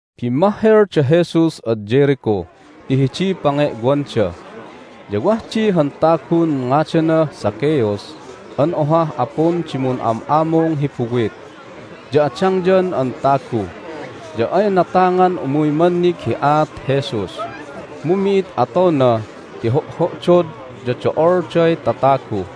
Bimmahhel da Jesus ad Jericho ti hidiy pange'wanda. Ya wah di han tagun ngadanah Zacchaeus an ohah apun di mun'am'amung hi buwit, ya adangyan an tagu. Ya ay natangan umuy mannig hi aat Jesus, mu mi'id atona ti ho'ho'dod, ya do'olday tatagu.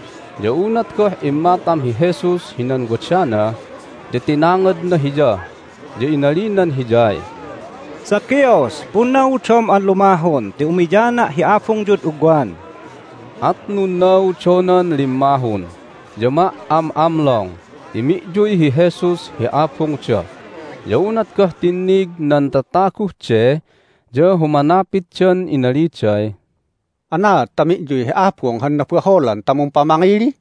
Ya unat goh immatam hi Jesus hinan wadana ya tinangadna hiya, ya inalinan hiyay, "Zacchaeus, punnaudom an lumahun ti umiyana' hi abungyud ugwan." At nunnaudonan limmahun, ya ma"am'amlong ti mi'yuy hi Jesus hi abungda. Ya unat goh tinnig nan tataguh de ya humanapitdan, inaliday, "Anaad ta mi'yuy hi abung han nabaholan ta mumpamangili?"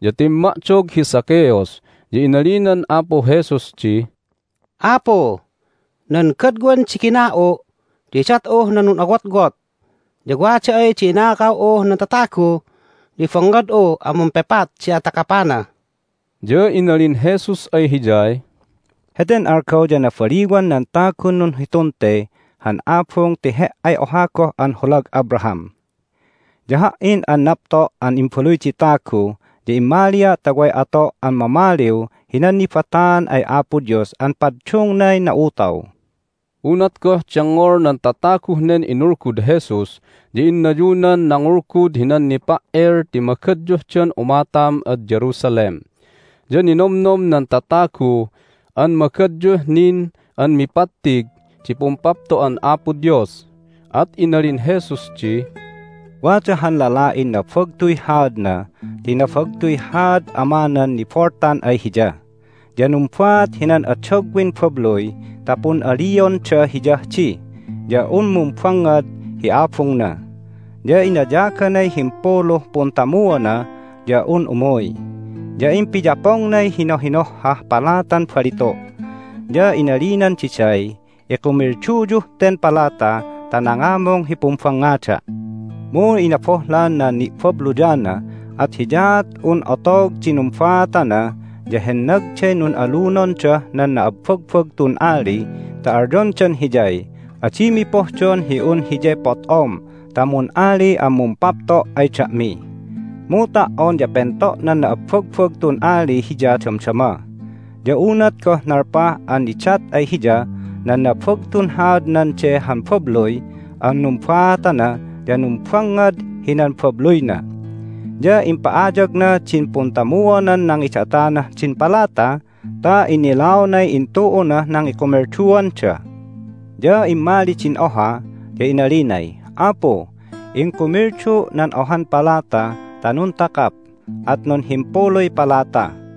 Ya timma'dog hi Zacchaeus, ya inalinan Apu Jesus di, "Apu, nan godwan di gina'u' ya idat'uh nan nun'awotwot, ya wada ay di inakaw'uh nan tatagu ya ibangngad'u an mumpepat di atakapana." Ya inalin Jesus ay hiyay, "Heten algaw ya nabaliwan nan tagun nunhitun te han abung ti he"ay oha goh an holag Abraham! Ya Ha"in an napto' an Imbaluy di Tagu ya immalia' ta way ato' an mamaliw hinan nibataan ay Apo Dios an paddungnay na'utaw." Unat goh dengngol nan tataguh nen inulgud Jesus ya innayunan nangulgud hinan nipa"el ti magadyuhdan umatam ad Jerusalem, ya ninomnom nan tatagu an magadyuh nin an mipattig di Pumpapto'an Apo Dios. At inalin Jesus di, "Wada han lala'in nabagtuy haadna (ti nabagtuy haad amanan niboltan ay hiya), ya numbaat hinan adagwin babluy ta pun'alionda hiyah di ya un mumbangngad hi abungna. Ya inayaganay himpuluh puntamuona ya un umuy. Ya impiyapongnay hinohinohhah palatan balitu', ya inalinan diday, Ikumilduyuh ten palata' ta nangamung hi pumbangngada'. Mu inabohlan nan ni'babluyana, at hiyaat un otog di numbaatana ya hennagday nun'alunondah nan na'abbagbagtun ali ta alyondan hiyay, Adimi pohdon hi un hiyay pot'om ta mun'ali an mumpapto' ay da'mi! Mu ta"on ya pento' nan na'abbagbagtun ali hiya damdama. Ya unat goh nalpah an nidat ay hiya nan nabagtun haadnan de han babluy an numbaatana ya numbangngad hinan babluyna. Ya impa'ayagna din puntamuonan nangidatanah din palata ta innilaonay intu'unah nangikumilduanda. Ya immali din oha, ya inalinay, Apu, ingkumildu' nan ohan palata ta nuntakap, at nunhimpuluy palata.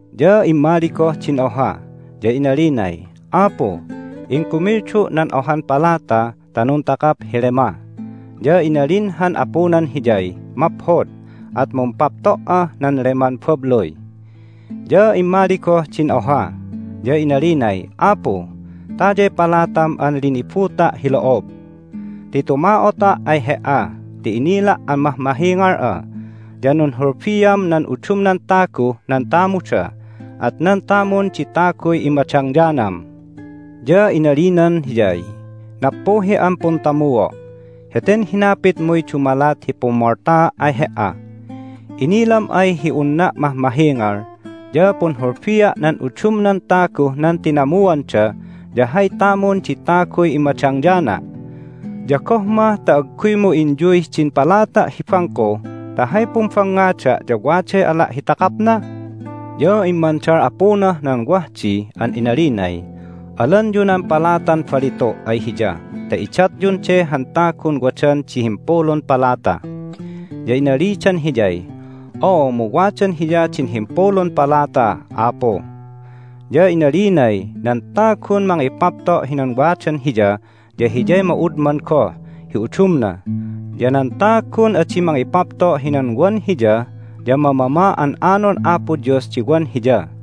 Ya immali goh din oha, ya inalinay, Apu, ingkumildu' nan ohan palata ta nuntakap hi lema. Ya inalin han apunan hiyay, Maphod, at mumpapto"ah nan leman babluy! Ya immali goh din oha, ya inalinay, Apu, tayay palatam an linibuta' hi lo'ob. Ti tuma'ota' ay he"a ti inila' an mahmahingal'a, ya nunhulbiam nan udumnan taguh nan tamuda, at nan tamun di taguy immadangyanam. Ya inalinan hiyay, Nappuhi'an puntamuo'! Heten hinapitmuy dumalat hi pummoltaa' ay he"a! Innilam ay hi unna' mahmahingal, ya punhulbia' nan udumnan taguh nan tinamuanda, ya hay tamun di taguy immadangyana'! Ya goh mah ta agguymu inyuy din palata' hi bangko ta hay pumbangngada' ya waday ala' hi takapna? Ya immandal apunah nan wah di an inalinay, Alanyu nan palatan balitu' ay hiya ta idatyun de han tagun wadan di himpulun palata! Ya inalidan hiyay, Oo, mu wadan hiya din himpulun palata, Apu! Ya inalinay, Nan tagun mangipapto' hinan wadan hiya ya hiyay ma'udman goh hi udumna, ya nan tagun adi mangipapto' hinan wan hiya ya mamama an anon Apo Dios di wan hiya.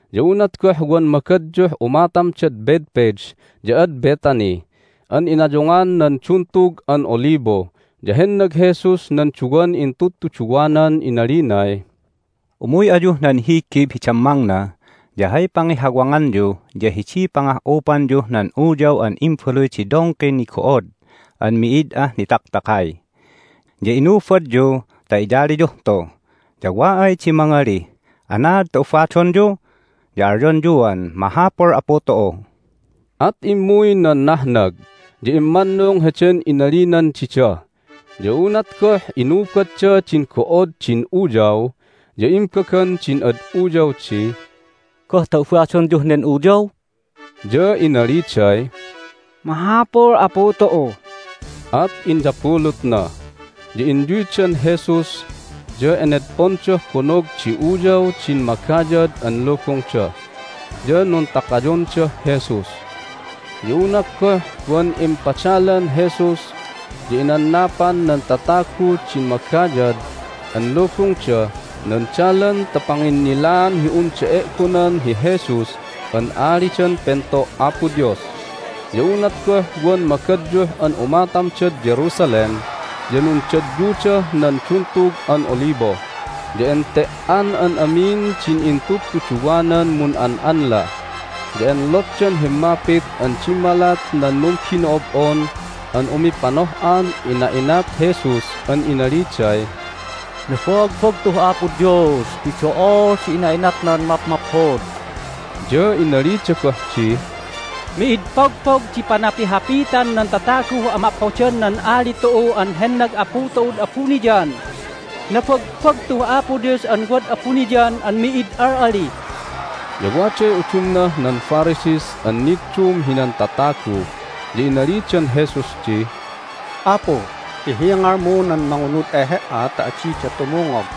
Ya unat goh wan magadyuh umatamdad Bethphage ya ad Bethany an inayungan nan Duntug an Olibo ya hennag Jesus nan duwan intudtuduwanan inalinay, "Umuy ayuh nan higib hi dammangna. Ya hay pangihawanganyu ya hidiy pangah'upanyuh nan uyaw an imbaluy di dongkin nigo'od an mi'id ah nitaktakay. Ya inubadyu ta iyaliyuh tu. Ya wa ay di mangalih, Anaad ta ubadonyu? ya alyonyuan, Mahapul Apu tu'u." At immuy nan nahnag, ya immannung heden inalinan dida. Ya unat goh inubadda din go'od din uyaw ya imbagan din ad uyaw di, "Goh ta ubadonyuh nen uyaw?" Ya inaliday, "Mahapul Apu tu'u." At inyabulutna. Ya inyuydan Jesus, ya enedpondah bonog di uyaw din magayad an lubungda, ya nuntakayondah Jesus. Ya unat goh wan impadalan Jesus ya inannapan nan tataguh din magayad an lubungda nan dalan ta panginnilaan hi unda e'gonan hi Jesus an Alidan Pento' Apo Dios. Ya unat goh wan magadyuh an umatamdad Jerusalem ya nundadyudah nan Duntug an Olibo, ya ente"an an amin din intudtuduwanan mun'an'anla, ya enlotdan himmapit an dimmalat nan numbino'ob'on an umipanoh'an ina'inat Jesus an inaliday, "Nabagbagtuh Apo Dios ti do'ol di ina'inatnan mapmaphod!" Ya inalida goh di, "Mi'id pogpog di panapihapitan nan tataguh amaphodan nan Ali tu'u an hennag Apu tu'ud abuniyan! Nabagbagtuh Apo Dios an wad abuniyan an mi'id al'ali!" Ya waday udumnah nan Pharisees an niddum hinan tatagu, ya inalidan Jesus di, "Apu, ihingalmu nan mangunud ay He"a ta adida tumungog!"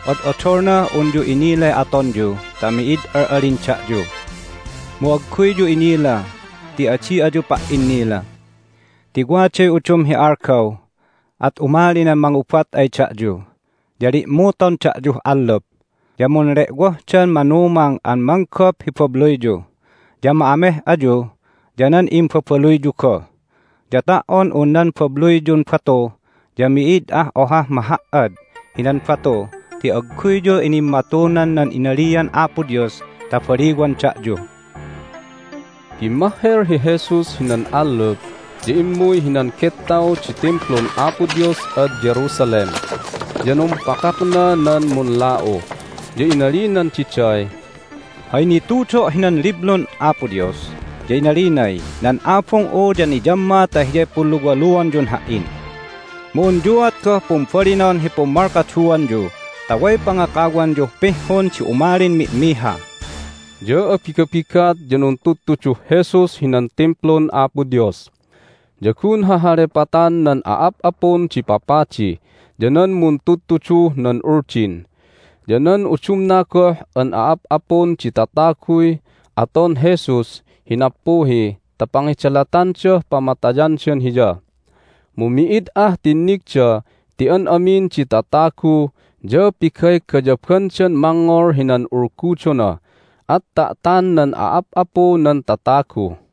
"Od'odolnah unyu inilay atonyu ta mi'id al'alin da'yu! Mu agguyyu inila ti adi ayu pa"innila! Ti waday udum hi algaw at umali nan mangubat ay da'yu, ya li'muton da'yuh allup, ya munle'wohdan mangumang an manggop hi babluyyu. Ya ma'ameh ayu ya nan imbabaluyyu goh. Ya ta"on un nan babluyyun batu ya mi'id ah ohah maha"ad hinan batu ti agguyyu inimmatunan nan inalian Apo Dios ta baliwan da'yu!" Bimmahhel hi Jesus hinan allup, ya immuy hinan gettaw di Timplun Apo Dios ad Jerusalem, ya numpakakna nan munla'u. Ya inalinan diday, "Hay nitudo' hinan Liblun Apo Dios ya inalinay, Nan Abung'u ya niyamma ta hiyay punluwaluanyun Ha"in. Mu unyuat goh pumbalinon hi pummalkaduanyu ta way pangakawanyuh pihhun di umalin mi'miha." Ya abigabigat ya nuntudtuduh Jesus hinan Timplun Apo Dios. Ya gun hahalepatan nan a'ap'apun di papadi, ya nan muntudtuduh nan Uldin, ya nan udumna goh an a'ap'apun di tataguy aton Jesus hi nappuhi ta pangidalatandah pamatayandan Hiya. Mu mi'id ah tinnigda ti an amin di tatagu ya pigaygayabandan mangngol hinan ulgudona, at ta'tan nan a'ap'apu nan tatagu.